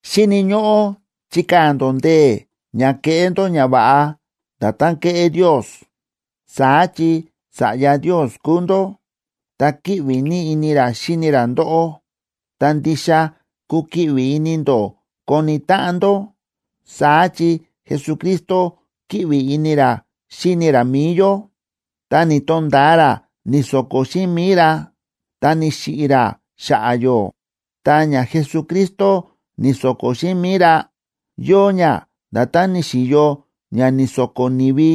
Xíni̱ ñóꞌó chikaa̱ ndó ndee̱ ña keꞌé ndó ñava̱ꞌa nda̱tán kéꞌé Ndios. Saá chi sa̱ꞌya Ndios kúu ndó ta kíꞌvi ní ini ra xíni ra ndóꞌó. Ta ndixa kukiꞌvi ini ndó koni táꞌan ndó. Saá chi Jesucristo kíꞌvi ini ra xíni ra mi̱i yó, ta ni̱to̱nda̱a ra ni̱so̱ko̱ xíꞌin mi̱i ra ta ni̱xiꞌi̱ ra xa̱ꞌa̱ yó. Ta ña Jesucristo ni̱so̱ko̱ xíꞌin mi̱i ra, yóo ña nda̱tán ni̱xi̱yo ña ni̱so̱ko̱ ni̱vi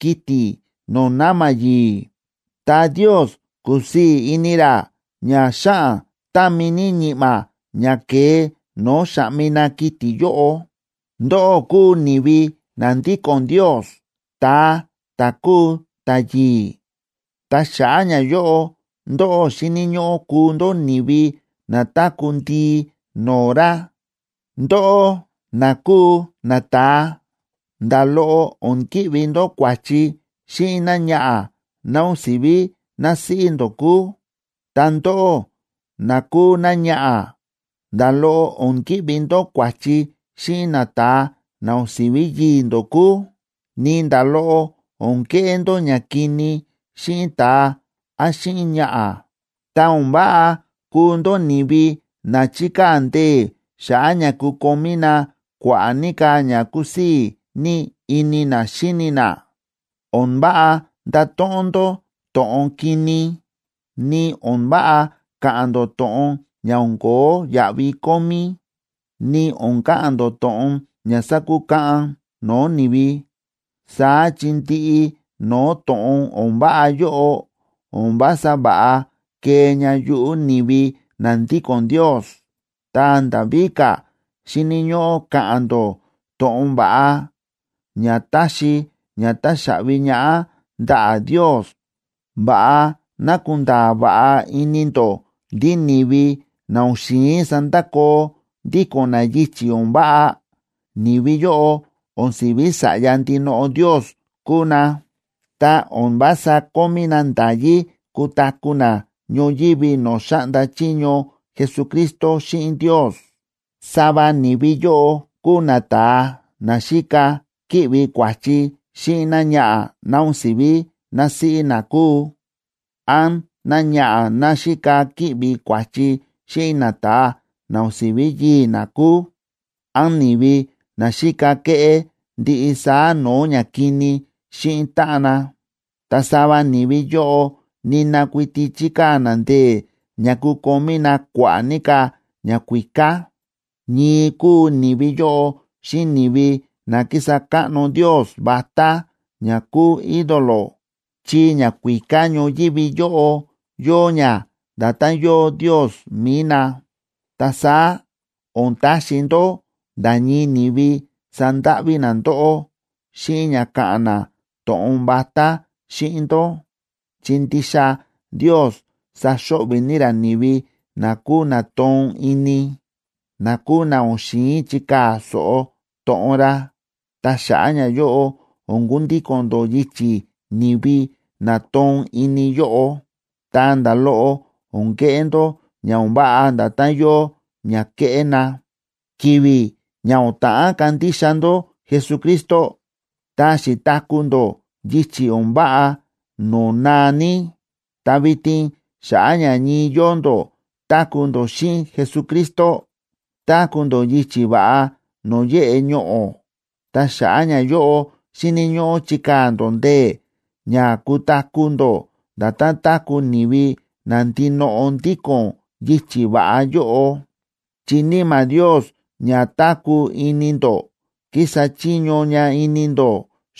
kiti̱ no̱o̱ na̱ma̱ yi̱i̱, ta Ndios ku̱sii̱ ini ra ña xáꞌan támi ní ñi̱ꞌma̱ ña ke̱e no̱o̱ xáꞌmi na kiti̱ yóꞌo. Ndóꞌó kúu ni̱vi na ndíko̱n Ndios, ta̱a ta̱ kúu ta̱yi̱i̱. Ta xa̱ꞌa̱ ñayóꞌo ndóꞌó xíni̱ ñóꞌó kuu ndó ni̱vi na táku̱ ndii no̱o̱ ra. Ndóꞌó na kúu nata̱a, nda̱ loꞌo o̱n ki̱ꞌvi ndó kua̱chi xíꞌin náñaꞌa̱ ná o̱n si̱ví násíꞌí ndó kúu. Ta ndóꞌó na kúu náñaꞌa̱, nda̱ loꞌo o̱n ki̱ꞌvi ndó kua̱chi xíꞌin nata̱a na o̱n si̱ví yii̱ ndó kúu. Ni nda̱ loꞌo o̱n keꞌé ndó ñakini xíꞌin ta̱a án xíꞌin ñaꞌa̱. Ta o̱n váꞌa kuu ndó ni̱vi na chikaa̱ ndee̱ xa̱ꞌa̱ ña kukomí na kua̱ꞌa̱ ní ka̱ ña kúsii̱ ní ini na xíni na. O̱n váꞌa ndato̱ꞌon ndó to̱ꞌon kini, ni o̱n váꞌa ka̱ꞌa̱n ndó to̱ꞌon ña o̱n ko̱ó yaꞌvi kómí, ni o̱n ka̱ꞌa̱n ndó to̱ꞌon ña sakukaꞌan no̱o̱ ni̱vi. Saá chi ndiꞌi no̱o̱ to̱ꞌon o̱n váꞌa yóꞌo o̱n vása va̱ꞌa kee ña yuꞌu̱ ni̱vi na ndíko̱n Ndios. Ta nda̱ víka̱, xíni̱ ñóꞌó ka̱ꞌa̱n ndó to̱ꞌon va̱ꞌa, ña táxi ña táxaꞌvi ñaꞌá ndaꞌa̱ Ndios. Va̱ꞌa ná kunda̱a̱ va̱ꞌa ini ndó ndí ni̱vi na o̱n xi̱in sandakoo ndíko̱n na yichi̱ o̱n váꞌa, ni̱vi yóꞌo o̱n si̱ví sa̱ꞌya ndinoꞌo Ndios kúu na, ta o̱n vása kómí na nda̱yí kutaku̱ na ñoyívi no̱o̱ xáꞌnda chiño Jesucristo xíꞌin Ndios. Sava ni̱vi yóꞌo kúu nata̱a na xíka kíꞌvi kua̱chi xíꞌin náñaꞌa̱ ná o̱n si̱ví násíꞌí na kúu, án náñaꞌa̱ ná xíka kíꞌvi kua̱chi xíꞌin nata̱a na o̱n si̱ví yii̱ ná kúu, án ni̱vi na xíka kéꞌé ndiꞌi saá no̱o̱ ñakini xíꞌin táꞌan na. Ta sava ni̱vi yóꞌo nina kuiti chíkaa̱ na ndee̱ ña kukomí na kua̱ꞌa̱ ní ka̱ ñakuíká. Ñii kúu ni̱vi yóꞌo xíꞌin ni̱vi na kísa káꞌno ndios vatá ña kúu ídolo, chi ñakuíká ñoyívi yóꞌo yóo ña nda̱tán yóo ndios mi̱i na. Ta saá o̱n taxi ndó nda̱ ñii ni̱vi sandáꞌví na ndóꞌó xíꞌin ña káꞌa̱n na to̱ꞌon vatá xíꞌin ndó, chi ndixa Ndios saxo̱ꞌvi̱ ní ra ni̱vi na kúu na toon ini, na kúu na o̱n xi̱in chikaa̱ so̱ꞌo to̱ꞌon ra. Ta xa̱ꞌa̱ ñayóꞌo o̱n kundíko̱n ndó yichi̱ ni̱vi na toon ini yóꞌo, ta nda̱ loꞌo o̱n keꞌé ndó ña o̱n váꞌa nda̱tán yóo ña kéꞌé na. Ki̱vi̱ ña o̱n ta̱ꞌán kandixa ndó Jesucristo, ta xi̱taku̱ ndó yichi̱ o̱n váꞌa no̱o̱ naa ní. Ta vitin xa̱ꞌa̱ ña ñii yóo ndó táku̱ ndó xíꞌin Jesucristo, táku̱ ndó yichi̱ va̱ꞌa no̱o̱ yéꞌe ñoꞌo̱. Ta xa̱ꞌa̱ ñayóꞌo xíni̱ ñóꞌó chikaa̱ ndó ndee̱ ña kutaku̱ ndó nda̱tán táku̱ ni̱vi na ndinoꞌo ndíko̱n yichi̱ va̱ꞌa yóꞌo, chi Níma̱ Ndios ña táku̱ ini ndó kísa chiño ña ini ndó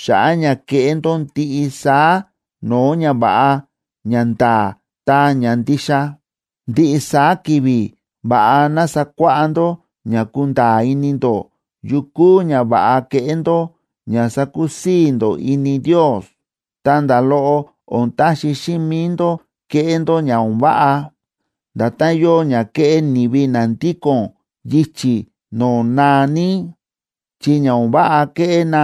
xa̱ꞌa̱ ña keꞌé ndó ndiꞌi saá no̱o̱ ñava̱ꞌa, ñanda̱a̱, ta ñandixa. Ndiꞌi saá ki̱vi̱ va̱ꞌa ná sakuáꞌá ndó ña kunda̱a̱ ini ndó yu kúu ñava̱ꞌa keꞌé ndó ña sakusii̱ ndó ini Ndios. Ta nda̱ loꞌo o̱n taxi xíꞌin mi̱i ndó keꞌé ndó ña o̱n váꞌa, nda̱tán yóo ña kéꞌé ni̱vi na ndíko̱n yichi̱ no̱o̱ naa ní, chi ña o̱n váꞌa kéꞌé na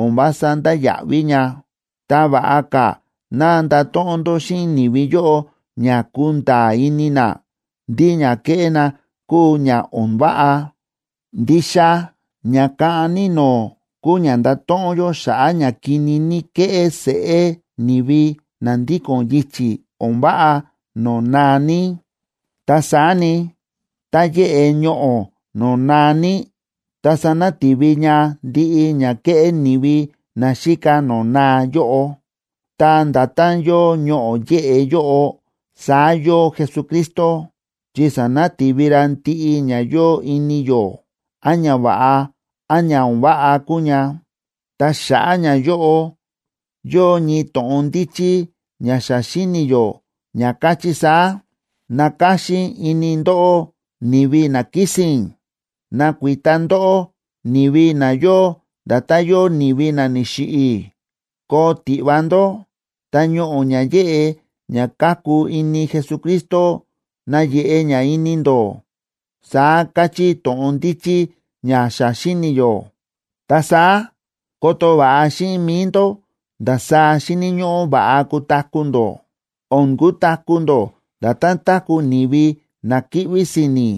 o̱n vása ndáya̱ꞌví ña. Ta va̱ꞌa ka̱ ná ndato̱ꞌon ndó xíꞌin ni̱vi yóꞌo ña kunda̱a̱ ini na ndí ña kéꞌé na kúu ña o̱n váꞌa. Ndixa ña kaꞌan ní no̱o̱ kúu ña ndato̱ꞌon yó xa̱ꞌa̱ ña kini ní kéꞌé seꞌé ni̱vi na ndíko̱n yichi̱ o̱n váꞌa no̱o̱ naa ní. Ta saá ni, tá yéꞌe ñoꞌo̱ no̱o̱ naa ní, ta sanati̱vi ña ndiꞌi ña kéꞌé ni̱vi na xíka no̱o̱ naa yóꞌo. Ta nda̱tán yóo ñoꞌo̱ yéꞌe yóꞌo, saá yóo Jesucristo, chi sánati̱vi ra ndiꞌi ña yóo ini yó, án ñava̱ꞌa án ña o̱n váꞌa kúu ña. Ta xa̱ꞌa̱ ñayóꞌo, yóo ñii to̱ꞌon ndíchí ña xa xíni̱ yó ña káchí saá: Nakáxín ini ndóꞌó, ni̱vi na kísi̱n; nakuita ndóꞌó, ni̱vi na yóo nda̱tán yóo ni̱vi na ni̱xiꞌi̱. Koo tiꞌva ndó, ta ñoꞌo̱ ña yéꞌe ña káku ini Jesucristo nayeꞌe ña ini ndó, saá káchí to̱ꞌon ndíchí ña xa xíni̱ yó. Ta saá koto va̱ꞌa xíꞌin mi̱i ndó ndasaá xíni̱ ñóꞌó va̱ꞌa kutaku̱ ndó. O̱n kutaku̱ ndó nda̱tán táku̱ ni̱vi na kíꞌví si̱ni̱,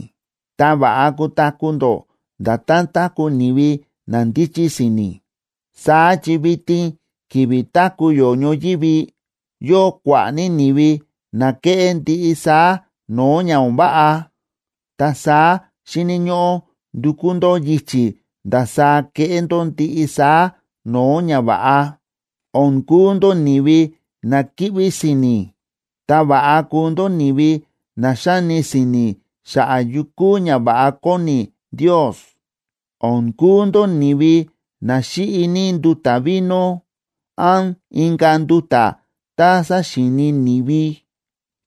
ta va̱ꞌa kutaku̱ ndó nda̱tán táku̱ ni̱vi na ndíchí si̱ni̱. Saá chi vitin ki̱vi̱ táku̱ yó ñoyívi, yóo kua̱ꞌa̱ ní ni̱vi na kéꞌé ndiꞌi saá no̱o̱ ña o̱n váꞌa. Ta saá xíni̱ ñóꞌó ndukú ndó yichi̱ ndasaá keꞌé ndó ndiꞌi saá no̱o̱ ñava̱ꞌa. O̱n kuu ndó ni̱vi na kíꞌví si̱ni̱, ta va̱ꞌa kuu ndó ni̱vi na xáni si̱ni̱ xa̱ꞌa̱ yu kúu ñava̱ꞌa kóni Ndios. O̱n kuu ndó ni̱vi na xíꞌi ní nduta̱ vino án inka̱ nduta̱ tá saxíini ni̱vi,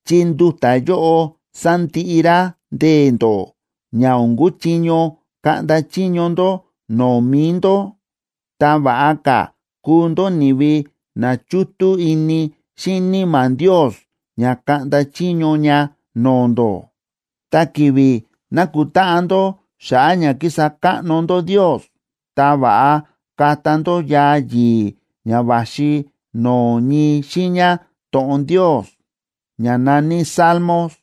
chi nduta̱ yóꞌo sándiꞌi rá ndee̱ ndó ña o̱n kuchiño kaꞌnda chiño ndó no̱o̱ mi̱i ndó. Ta va̱ꞌa ka̱ kuu ndó ni̱vi na chútú ini xíꞌin Níma̱ Ndios ña kaꞌnda chiño ña no̱o̱ ndó. Ta ki̱vi̱ nákutáꞌan ndó xa̱ꞌa̱ ña kísa káꞌno ndó Ndios, ta va̱ꞌa kata ndó yaa yi̱i̱ ña va̱xi no̱o̱ ñii xiiña to̱ꞌon Ndios, ña na̱ní Salmos.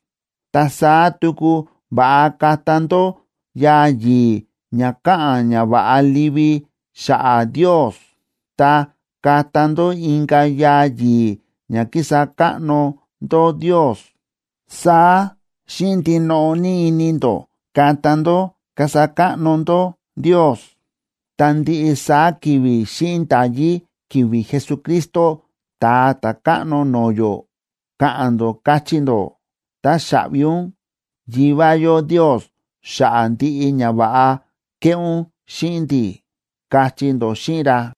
Ta saá tuku va̱ꞌa kata ndó yaa yi̱i̱ ña káꞌa̱n ñava̱ꞌa livi xa̱ꞌa̱ Ndios, ta kata ndó inka̱ yaa yi̱i̱ ña kísa káꞌno ndó Ndios. Saá xíꞌin ndinoꞌo ní ini ndó kata ndó kasa káꞌno ndó Ndios. Ta ndiꞌi saá ki̱vi̱ xíꞌin nda̱yí ki̱vi̱ Jesucristo, Ta̱a Ta̱káꞌno no̱o̱ yó, ka̱ꞌa̱n ndó, kachí ndó: “Táxaꞌvi ún, Yivá yó Ndios xa̱ꞌa̱ ndiꞌi ñava̱ꞌa kéꞌé ún xíꞌin ndi̱”, kachí ndó xíꞌin ra.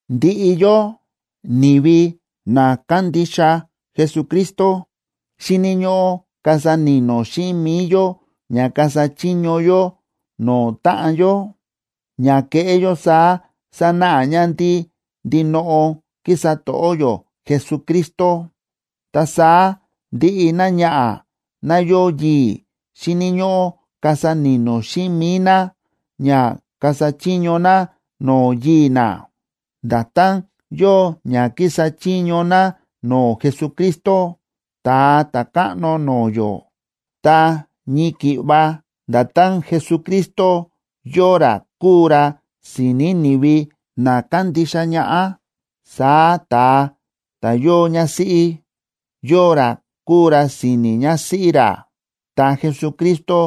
Ndiꞌi yó, ni̱vi na kándixa Jesucristo xíni̱ ñóꞌó kasa ni̱no̱ xíꞌin mi̱i yó ña kasa chiño yó no̱o̱ táꞌan yó. Ña keꞌé yó saá sanáꞌa ña ndí ndinoꞌo kísa to̱ꞌó yó Jesucristo. Ta saá ndiꞌi náñaꞌa̱ ná yóo yii̱ xíni̱ ñóꞌó kasa ni̱no̱ xíꞌin mi̱i ná ña kasa chiño ná no̱o̱ yii̱ ná, nda̱tán yóo ña kísa chiño ná no̱o̱ Jesucristo, Ta̱a Ta̱káꞌno no̱o̱ yó. Ta ñii ki̱ꞌva nda̱tán Jesucristo yóo ra kúu ra si̱ni̱ ni̱vi na kándixa ñaꞌá, saá ta̱a ta̱ yóo ñásíꞌí, yóo ra kúu ra si̱ni̱ ñásíꞌí ra. Ta Jesucristo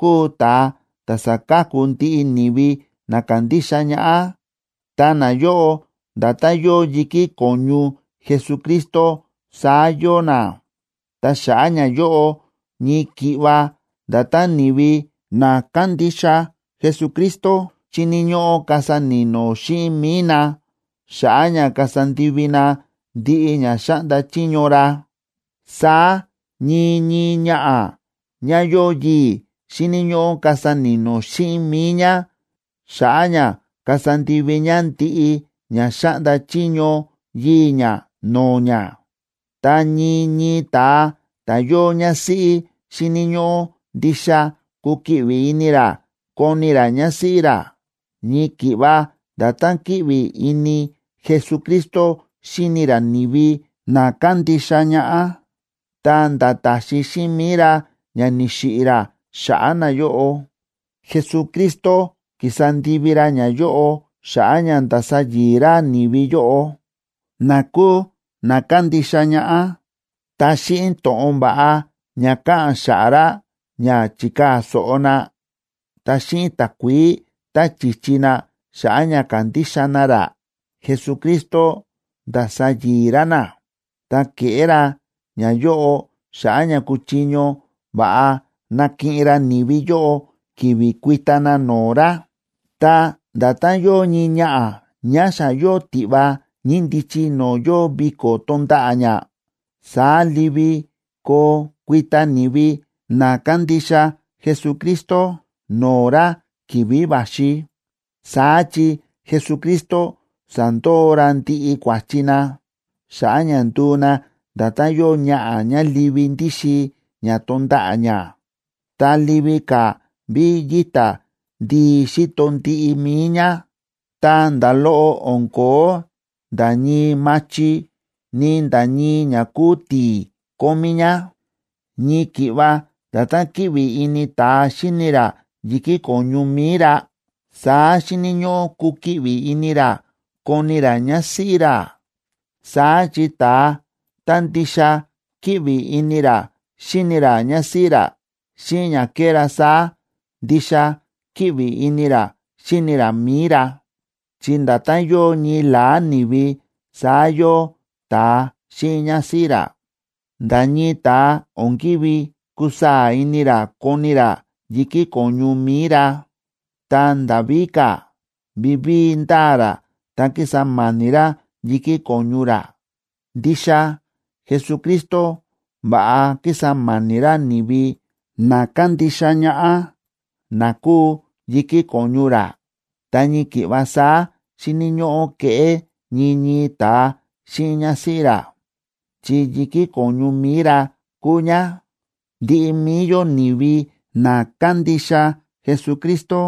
kúu ta̱a ta̱ sáka̱ku ndiꞌi ni̱vi na kándixa ñaꞌá, ta nayóꞌo nda̱tán yóo yi̱kí ko̱ñu Jesucristo, saá yóo na. Ta xa̱ꞌa̱ ñayóꞌo, ñii ki̱ꞌva nda̱tán ni̱vi na kándixa Jesucristo xíni̱ ñóꞌó kasa ni̱no̱ xíꞌin mi̱i na xa̱ꞌa̱ ña kasa ndivi na ndiꞌi ña xáꞌnda chiño ra, saá ñii ñii ñaꞌa̱ ñá yóo yii̱ xíni̱ ñóꞌó kasa ni̱no̱ xíꞌin mi̱i ñá xa̱ꞌa̱ ña kasa ndivi ñá ndiꞌi ña xáꞌnda chiño yii̱ ñá no̱o̱ ñá. Ta ñii ñii ta̱a ta̱ yóo ñásíꞌí xíni̱ ñóꞌó ndixa kukiꞌvi ini ra koni ra ñásíꞌí ra, ñii ki̱ꞌva nda̱tán kíꞌvi ini Jesucristo xíni ra ni̱vi na kándixa ñaꞌá, ta̱nda̱ ta̱xi xíꞌin mi̱i ra ña ni̱xiꞌi̱ ra xa̱ꞌa̱ nayóꞌo. Jesucristo ki̱sa ndivi ra ñayóꞌo xa̱ꞌa̱ ña ndasa yi̱i̱ ra ni̱vi yóꞌo na kúu na kándixa ñaꞌá. Ta xíꞌin to̱ꞌon va̱ꞌa ña káꞌa̱n xa̱ꞌa̱ ra ña chi̱kaa̱ so̱ꞌo na, ta xíꞌin takuií tá chi̱chi na xa̱ꞌa̱ ña ka̱ndixa na ra, Jesucristo nda̱sa yi̱i̱ ra na. Ta ke̱ꞌé ra ñayóꞌo xa̱ꞌa̱ ña kuchiño va̱ꞌa nakiꞌin ra ni̱vi yóꞌo ki̱vi̱ kuita na no̱o̱ ra. Ta nda̱tán yóo ñii ñaꞌa̱ ñá xa yóo tiꞌva ñíndichi no̱o̱ yóo viko̱ tonda̱ꞌa̱ ñá, saá livi koo kuita ni̱vi na kándixa Jesucristo no̱o̱ ra ki̱vi̱ va̱xi. Saá chi Jesucristo sa̱ndoo ra ndiꞌi kua̱chi na, xa̱ꞌa̱ ña nduu na nda̱tán yóo ñaꞌa̱ ñá livi ndíxin ñá tonda̱ꞌa̱ ñá, ta livi ka̱ ví yíta ndii xíto ndiꞌi mi̱i ñá, ta nda̱ loꞌo o̱n ko̱ó nda̱ ñii machi, ni nda̱ ñii ña kúu ti̱i̱ kómí ñá. Ñii ki̱ꞌva nda̱tán kíꞌvi ini ta̱a xíni ra yi̱kí ko̱ñu mi̱i ra, saá xíni̱ ñóꞌó kukiꞌvi ini ra koni ra ñásíꞌí ra. Saá chi ta̱a ta̱ ndixa kíꞌvi ini ra xíni ra ñásíꞌí ra, xíꞌin ña kéꞌé ra saá, ndixa kíꞌvi ini ra xíni ra mi̱i ra, chi nda̱tán yóo ñii la̱á ni̱vi saá yóo ta̱a xíꞌin ñásíꞌí ra. Nda̱ ñii ta̱a o̱n ki̱ví kusaa̱ ini ra koni ra yi̱kí ko̱ñu mi̱i ra. Ta nda̱ víka̱, vivíi ndáa ra ta kísa ma̱ni̱ ra yi̱kí ko̱ñu ra. Ndixa Jesucristo va̱ꞌa kísa ma̱ni̱ ra ni̱vi na kándixa ñaꞌá, na kúu yi̱kí ko̱ñu ra, ta ñii ki̱ꞌva saá xíni̱ ñóꞌó keꞌé ñii ñii ta̱a xíꞌin ñásíꞌí ra, chi yi̱kí ko̱ñu mi̱i ra kúu ñá. Ndiꞌi mi̱i yó ni̱vi na kándixa Jesucristo,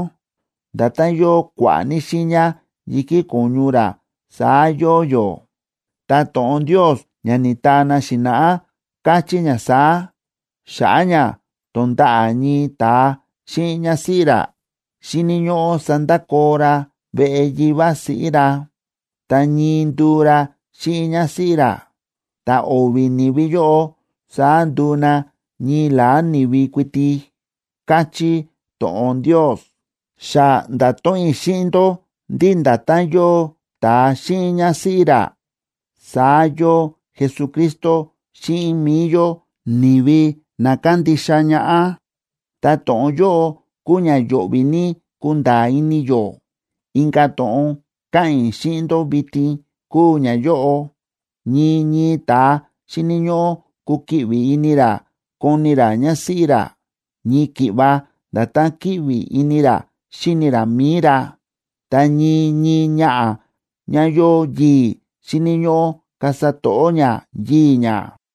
nda̱tán yóo kua̱ꞌa̱ ní xiiña yi̱kí ko̱ñu ra saá yóo yó. Ta to̱ꞌon Ndios ña ni̱taa na xi̱na̱ꞌá káchí ña saá: “Xa̱ꞌa̱ ña tonda̱ꞌa̱ ñii ta̱a xíꞌin ñásíꞌí ra, xíni̱ ñóꞌó sandakoo ra veꞌe yivá siꞌí ra, ta ñii nduu ra xíꞌin ñásíꞌí ra. Ta o̱vi̱ ni̱vi yóꞌo saá nduu na ñii la̱á ni̱vi kuiti”, káchí to̱ꞌon Ndios. Xa nda̱to̱ꞌon i̱ xíꞌin ndó ndí nda̱tán yóo ta̱a xíꞌin ñásíꞌí ra, saá yóo Jesucristo xíꞌin mi̱i yó ni̱vi na kándixa ñaꞌá. Ta to̱ꞌon yóꞌo kúu ña yo̱ꞌvi̱ ní kunda̱a̱ ini yó. Inka̱ to̱ꞌon káꞌa̱n i̱ xíꞌin ndó vitin kúu ñayóꞌo: Ñii ñii ta̱a xíni̱ ñóꞌó kukiꞌvi ini ra koni ra ñásíꞌí ra, ñii ki̱ꞌva nda̱tán kíꞌvi ini ra xíni ra mi̱i ra. Ta ñii ñii ñaꞌa̱ ñá yóo yii̱, xíni̱ ñóꞌó kasa to̱ꞌó ñá yii̱ ñá.